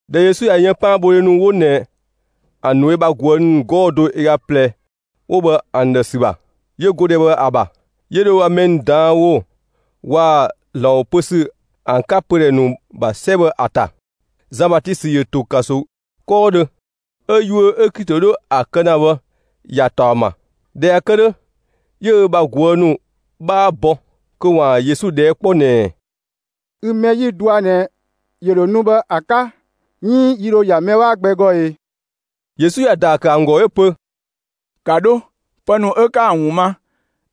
꞊Dhɛ Yesu ꞊ya yën 'paanbhodhe ‑nu 'wo ꞊nɛ ‑an ‑nu ö bha ꞊guë' ‑nu 'gɔɔ‑ do ö ga ꞊plɛ 'wo bhë ‑an ‑dhë ‑sü ‑bha, 'yö go ‑dhɛ bhë ‑a ‑bha, 'yö dho ö bha mɛ ‑nu ꞊daan' ‑wo waa‑ ‑Zlan ‑wo pö ‑sü ‑an 'ka pödhɛ ‑nu ‑bha 'sɛ bhë ‑a ‑ta. Zan Batisö ‑yö ‑to ‑kanso 'kɔɔdhö, 'ö yuö 'ö Klito 'dhö ‑a kë ‑na bhë ‑ya ‑taɔ ‑ma. ꞊Dhɛ ꞊ya kë 'dhö, 'yö ö bha ꞊guë' ‑nu 'bhaa bɔ, kö ‑waan Yesu ꞊dhɛɛ' 'kpɔ ꞊nɛɛ: «Ü mɛ 'ö 'yi‑ dɔa ꞊nɛ ‑yö ‑dho nu bhë ‑a 'ka, 'iin yi ‑dho ‑ya mɛ gbɛ 'bhaa ‑gɔ ee?» Yesu ‑ya ‑daa ‑kë ‑an ‑gɔ 'yö‑ pö: «‑Ka 'dho, pë ‑nu 'ka ‑an ‑wun ma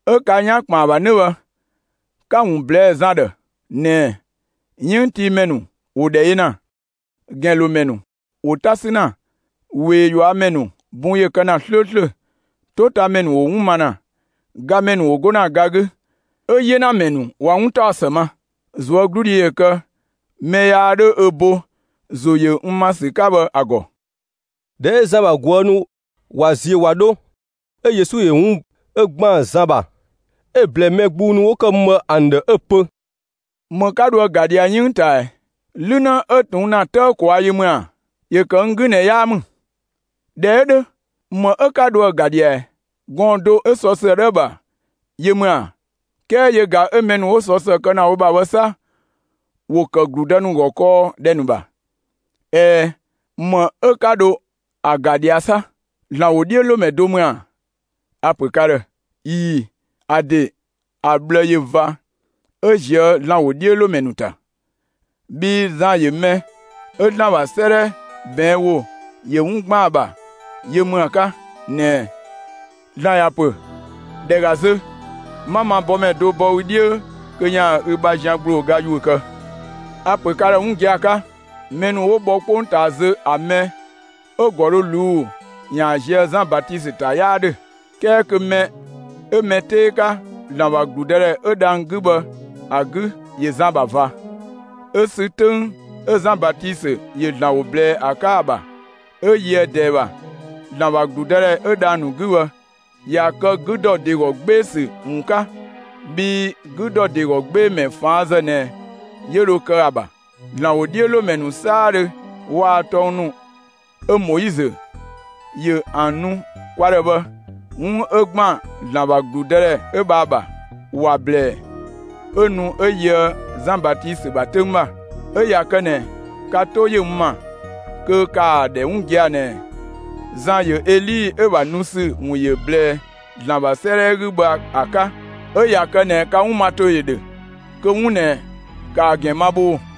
'ö 'ka 'yan ‑kpën ‑a ‑bha 'nö bhë, 'ka‑ ‑wun ꞊blɛɛ'‑ Zan ‑dhë ꞊nɛɛ: 'Yënngtiimɛ ‑nu ‑wo ‑dhɛ yö ‑na, ‑gɛnlomɛ ‑nu ‑wo 'ta ‑sü ‑na, ꞊wee ꞊yuamɛ ‑nu bun ꞊ya kë 'slööslö, 'totamɛ ‑nu ‑wo 'wun ma ‑na, gamɛ ‑nu ‑wo 'go ‑na ga 'gü, 'ö 'yenamɛ ‑nu ꞊wa 'wuntaɔsë ma. ꞊Zuögludhi ‑yö kë mɛ yaa 'dho ö bo ‑zo ‑yö n ‑ma ‑sü 'ka bhë ‑a ‑gɔ!» ꞊Dhɛ 'ö Zan ‑bha ꞊guë' ‑nu ꞊wa ziö ꞊wa 'dho, 'ö Yesu ‑yö 'wun 'ö ‑gban Zan ‑bha 'ö‑ ꞊blɛɛ mɛ gbung ‑nu 'wo ‑kë mü bhë ‑an ‑dhë, 'ö‑ pö: «‑Më 'ka dho ‑a ‑ga ꞊dhia 'yënng ꞊taa ꞊ɛ? 'Lü 'në 'ö ꞊tuun' ‑na 'tëë ꞊kwaa' yö ‑mü ‑a? (‑Yö ‑kë n 'gü ꞊nɛ 'yaa ‑mü). ꞊Dhɛ 'ö 'dhö, ‑më 'ö 'ka dho ‑a ‑ga ꞊dhia ꞊ɛ? Gɔɔn‑ do 'ö sɔ ‑së 'dhö ‑a ‑bha yö ‑mü ‑a? 'Kɛɛ yö ꞊ga 'ö mɛ ‑nu 'wo sɔ ‑së kë ‑na wo ‑bha bhë 'sa, ‑wo ‑kë ‑gludë ‑nu ‑gɔ kɔɔ ‑dhɛ ‑nu ‑bha. ꞊Ɛɛ, ‑më 'ö 'ka dho ‑a ‑ga ꞊dhia 'sa? ‑Zlan ‑wodhiölomɛ do ‑mü ‑a? A‑ ‑pö ka ‑dhë, ꞊ii‑, ‑a ‑de ‑a ꞊bhlë ꞊yö ꞊va 'ö ‑ziö ‑Zlan ‑wodhiölomɛ ‑nu ‑ta. Bhii Zan ‑yö mɛ 'ö ‑Zlan ‑bha 'sëëdhɛ ꞊bɛɛn' ‑wo ‑yö 'wun ‑gban ‑a ‑bha yö ‑mü ‑a 'ka ꞊nɛɛ: ‑Zlan ‑ya ‑pö: ‑Dhɛ ‑ga zö, 'ma ma bɔmɛ do bɔ ü 'dhiö kö ‑yaan ü bha zian ‑gblooga ‑yuö kë. A‑ ‑pö ka ‑dhë 'wun gia‑ 'ka: Mɛ ‑nu 'wo bhɔ 'kpongtaa zö ‑a mɛ 'ö‑ ‑gɔ dho ꞊luu'‑ ‑yaan zië Zan Batisö ‑ta 'yaa 'dhö. 'Kɛɛ kö mɛ 'ö mɛ 'tee 'ka ‑Zlan ‑bha ‑gludëdhɛ 'ö dhang‑ 'gü bhë ‑a 'gü, ‑yö Zan ‑bha ꞊va. 'Ö sü 'töng 'ö Zan Batisö ‑yö ‑Zlan ‑wo ꞊blɛɛ ‑a 'ka ‑a ‑bha, 'ö yöë ꞊dɛɛ ‑bha, ‑Zlan ‑bha ‑gludëdhɛ 'ö dhang‑ ‑nu 'gü, ꞊ya kë 'gü ‑dɔ ‑de ‑gɔ 'gbee‑ ‑sü ‑wun 'ka; bhii 'gü ‑dɔ ‑de ‑gɔ 'gbee‑ ‑mɛ ꞊faanzë ꞊nɛ 'yö dho kë ‑a ‑bha. ‑Zlan ‑wodhiölomɛ ‑nu 'saadhö waa‑ tɔng ‑nu 'ö Moizö ‑yö ‑an nu kwa ‑dhë bhë, 'wun 'ö ‑gban ‑Zlan ‑bha ‑gludëdhɛ 'ö bhë ‑a ‑bha, ‑wa ‑blɛɛ 'ö nu 'ö yöë Zan Batisö ‑bha 'töng ‑bha. 'Ö ꞊ya kë ꞊nɛ, ka 'to ‑yö n ‑ma, kö ‑kaa ‑dhɛ 'wun gia‑ ꞊nɛɛ: Zan ‑yö Eli 'ö‑ ‑bha nu ‑sü ‑wun ‑yö ꞊blɛɛ ‑Zlan ‑bha 'sëëdhɛ 'gü bhë ‑a 'ka. 'Ö ꞊ya kë ꞊nɛ ka 'wun ma ‑to ‑yö ‑dhö, kö 'wun ꞊nɛ, ‑kaa ‑gɛn ma bhoo‑!»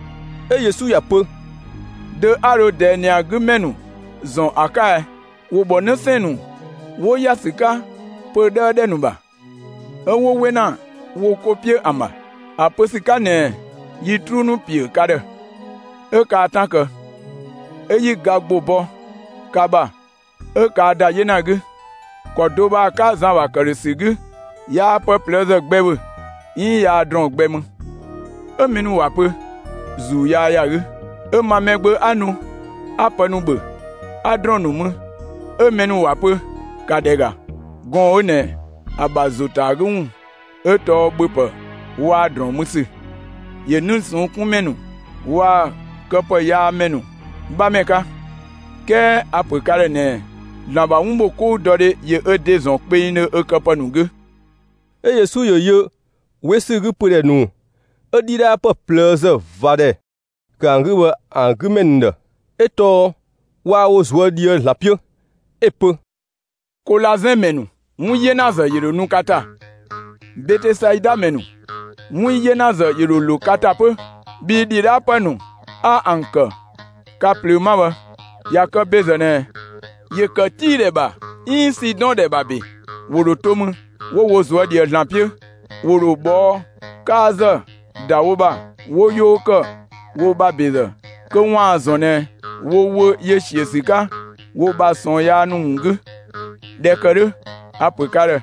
'Ö Yesu ‑ya pö: «Dö 'a dho ꞊dɛɛ ꞊nɛ ‑a 'gü ‑mɛ ‑nu ‑zɔn ‑a 'ka ɛ? ‑Wo ‑bhɔ 'në 'sɛɛn‑ ‑nu 'wo ‑ya ‑sü 'ka pö‑ 'dhëëdhö ‑dhɛ ‑nu ‑bha, 'ö 'wo 'we ‑na wo 'ko 'piö ‑an ‑bha ‑a pö ‑sü 'ka ꞊nɛɛ: ‹Yi 'truu ‑nu ‑piö ka ‑dhë, 'ö kaa 'tan kë, 'ö 'yi ga ‑gbo bɔ ka ‑bha 'ö kaa ‑da 'yena 'gü!› ‑Kɔ do bhë ‑a 'ka Zan ‑bha ‑këdhösü 'gü, yaa pë ꞊plëëzë gbɛ ‑bhö, 'iin yaa ‑drɔɔn gbɛ mü, 'ö mɛ ‑nu ‑wa pö: ‹‑Zuu yaa ‑ya 'gü!› 'Ö ma Mɛgbö 'a nu 'a pë ‑nu ‑bhö, 'a ‑drɔɔn ‑nu mü, 'ö mɛ ‑nu ‑wa pö: ‹‑Ka ‑dhɛ ‑ga, gɔɔn‑ 'ö ꞊nɛ ‑a ‑bha ‑zo ‑ta ‑a 'gü ‑wun 'ö tɔɔ ‑bhöpë ‑wun waa‑ ‑drɔɔn mü ‑sü; ‑yö 'nii‑ ꞊sɔnng' 'kun ‑mɛ ‑nu waa‑ këwunyaamɛ ‑nu 'bhamɛ 'ka!› 'Kɛɛ a‑ ‑pö ka ‑dhë ꞊nɛɛ: ‑Zlan ‑bha 'wunbhokoudɔdhe ‑yö ö ‑de ‑zɔn kpengdhö ö këpë ‑nu 'gü.» 'Ö Yesu ‑yö yö 'we ‑sü 'gü pödhɛ ‑nu 'ö ‑dhidhaapë ꞊plëëzë ꞊va ‑dhɛ ‑kë ‑an 'gü bhë ‑an 'gü ‑mɛ ‑nu ‑dhë, 'ö tɔɔ waa wo ꞊zuö' ꞊dhië'‑ ‑Zlan 'piö, 'ö‑ pö: «Kolazɛn ‑mɛ ‑nu, 'wun 'yenazë ‑yö ‑dho nu ka ‑ta; Betesaida ‑mɛ ‑nu, 'wun 'yenazë ‑yö ‑dho ‑lo ka ‑ta 'pö! Bhii ‑dhidhaapë ‑nu 'a ‑an kë ka ꞊plöö 'ma bhë, ꞊ya kë ‑bezë ꞊nɛ, ‑yö ‑kë Tii ‑dhɛ ‑bha 'iin Sidɔn ‑dhɛ ‑bha ‑be, ‑wo ‑dho to mü 'wo wo ꞊zuö' ꞊dhië ‑Zlan 'piö. ‑Wo ‑dho ꞊bhɔɔ' 'kaazë ‑da wo ‑bha 'wo 'yoo ‑kë wo ‑bha ‑bezë kö ‑waan ‑zɔn ꞊nɛ wo wö ‑yö ‑siö ‑sü 'ka wo ‑bha ꞊sɔɔn yaa ‑nu ‑wun 'gü. ꞊Dhɛ ‑kë 'dhö, a‑ ‑pö ka ‑dhë: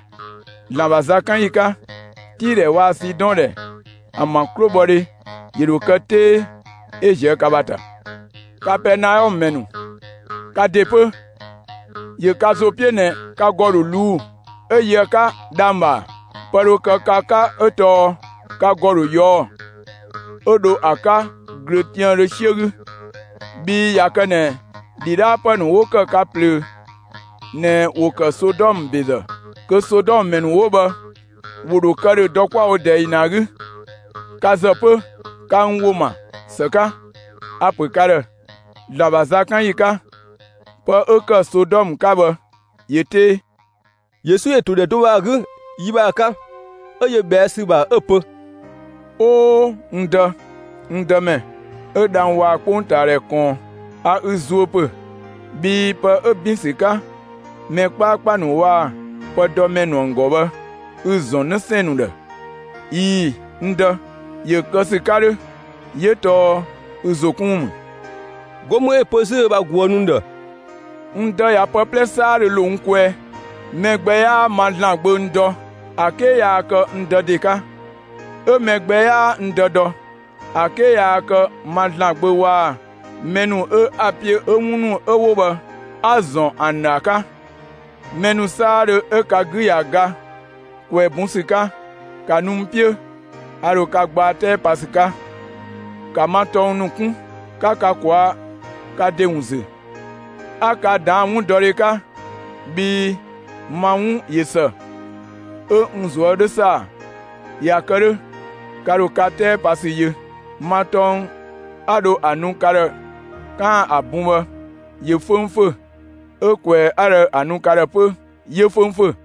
‑Zlan ‑bha zakanyi 'ka, Tii ‑dhɛ waa‑ Sidɔn ‑dhɛ ‑an ‑bha 'klobhɔdhe ‑yö ‑dho kë 'tee 'ö ꞊zië' ka ‑bha ‑ta. Kapɛɛnaɔmë ‑mɛ ‑nu, ka ‑de 'pö, ‑yö ka ‑zo 'piö ꞊nɛ, ka ‑gɔ ‑dho ꞊luu'‑, 'ö yö ‑a 'ka dhang‑ ‑bha ‑a? Pë dho kë ka 'ka 'ö tɔɔ ka ‑gɔ dho ꞊yɔɔ'‑ 'ö dho ‑a 'ka ꞊glöötiaandhö 'siö 'gü. Bhii ꞊ya kë ꞊nɛ ‑dhidhaapë ‑nu 'wo ‑kë ka ꞊plöö ꞊nɛ ‑wo ‑kë Sodɔmë ‑bezë, kö Sodɔmë ‑mɛ ‑nu 'wo bhë ‑wo ‑dho kë ‑dhö dɔ 'kwa‑ wo ꞊dɛɛ ‑yi 'ö ꞊nɛ ‑a 'gü. Ka ‑zë 'pö, ka n ‑wo ‑ma ‑së 'ka, a‑ ‑pö ka ‑dhë: ‑Zlan ‑bha zakanyi 'ka, pë 'ö ‑kë Sodɔmë 'ka bhë ‑yö 'tee.» Yesu ‑yö ‑to ‑dhɛ do bhë ‑a 'gü yi bhë ‑a 'ka, 'ö yö ꞊bhɛa' ‑sü ‑bha 'ö‑ pö: «'Oo, n Dë, n Dëmɛ, 'ö dhang‑ waa‑ 'kpongtaadhɛ ꞊kɔɔn, a ü zuö ‑pö, bhii pë 'ö ‑bin ‑sü 'ka mɛ 'kpaakpa ‑nu waa‑ pëdɔmɛ ‑nu ‑an ‑gɔ bhë 'ü‑ ‑zɔn 'në 'sɛɛn‑ ‑nu ‑dhë. ꞊Ii‑, n Dë, ‑yö kë ‑sü 'ka 'dhö, 'yö tɔɔ ü ‑zo 'kun ‑wun ‑mü.» 'Go mü 'ö‑ pö 'zü ö bha ꞊guë' ‑nu ‑dhë: «N Dë ꞊ya pë 'plɛ 'saadhö ‑lo n kwɛɛ. Mɛ gbɛ 'yaa ma ‑Zlan Gbö n dɔ, ‑a 'ke yaa kë n Dë ‑de 'ka. 'Ö mɛ gbɛ 'yaa n Dë dɔ, ‑a 'ke yaa kë ma ‑Zlan Gbö waa‑ mɛ ‑nu 'ö 'a‑ 'piö, 'ö 'wun ‑nu 'ö 'wo bhë 'a‑ ‑zɔn ‑an ‑dhë ‑a 'ka. Mɛ ‑nu 'saadhö 'ö ka 'gü ꞊ya ga ꞊kwɛɛ‑ bun ‑sü 'ka, ‑ka nu n 'piö; a ‑dho ka gbaa 'tɛɛ pa ‑sü 'ka! ‑Ka ma tɔng ‑nu 'kun, 'ka ka ꞊kwaa' ka ‑de ‑wun ‑zü, 'a ka ꞊daan' 'wundɔdhe 'ka, bhii ma 'wun ꞊yö ‑së, 'ö n ꞊zuö' 'dho ‑saa. ꞊Ya kë 'dhö, ka ‑dho ka 'tɛɛpasü yö. Ma tɔng 'a dho ‑a nu ka ‑dhë 'kaan‑ ‑a bun bhë ‑yö 'föngfö, 'ö ꞊kwɛɛ‑ 'a dho ‑a nu ka ‑dhë 'pö 'yö 'föngfö.»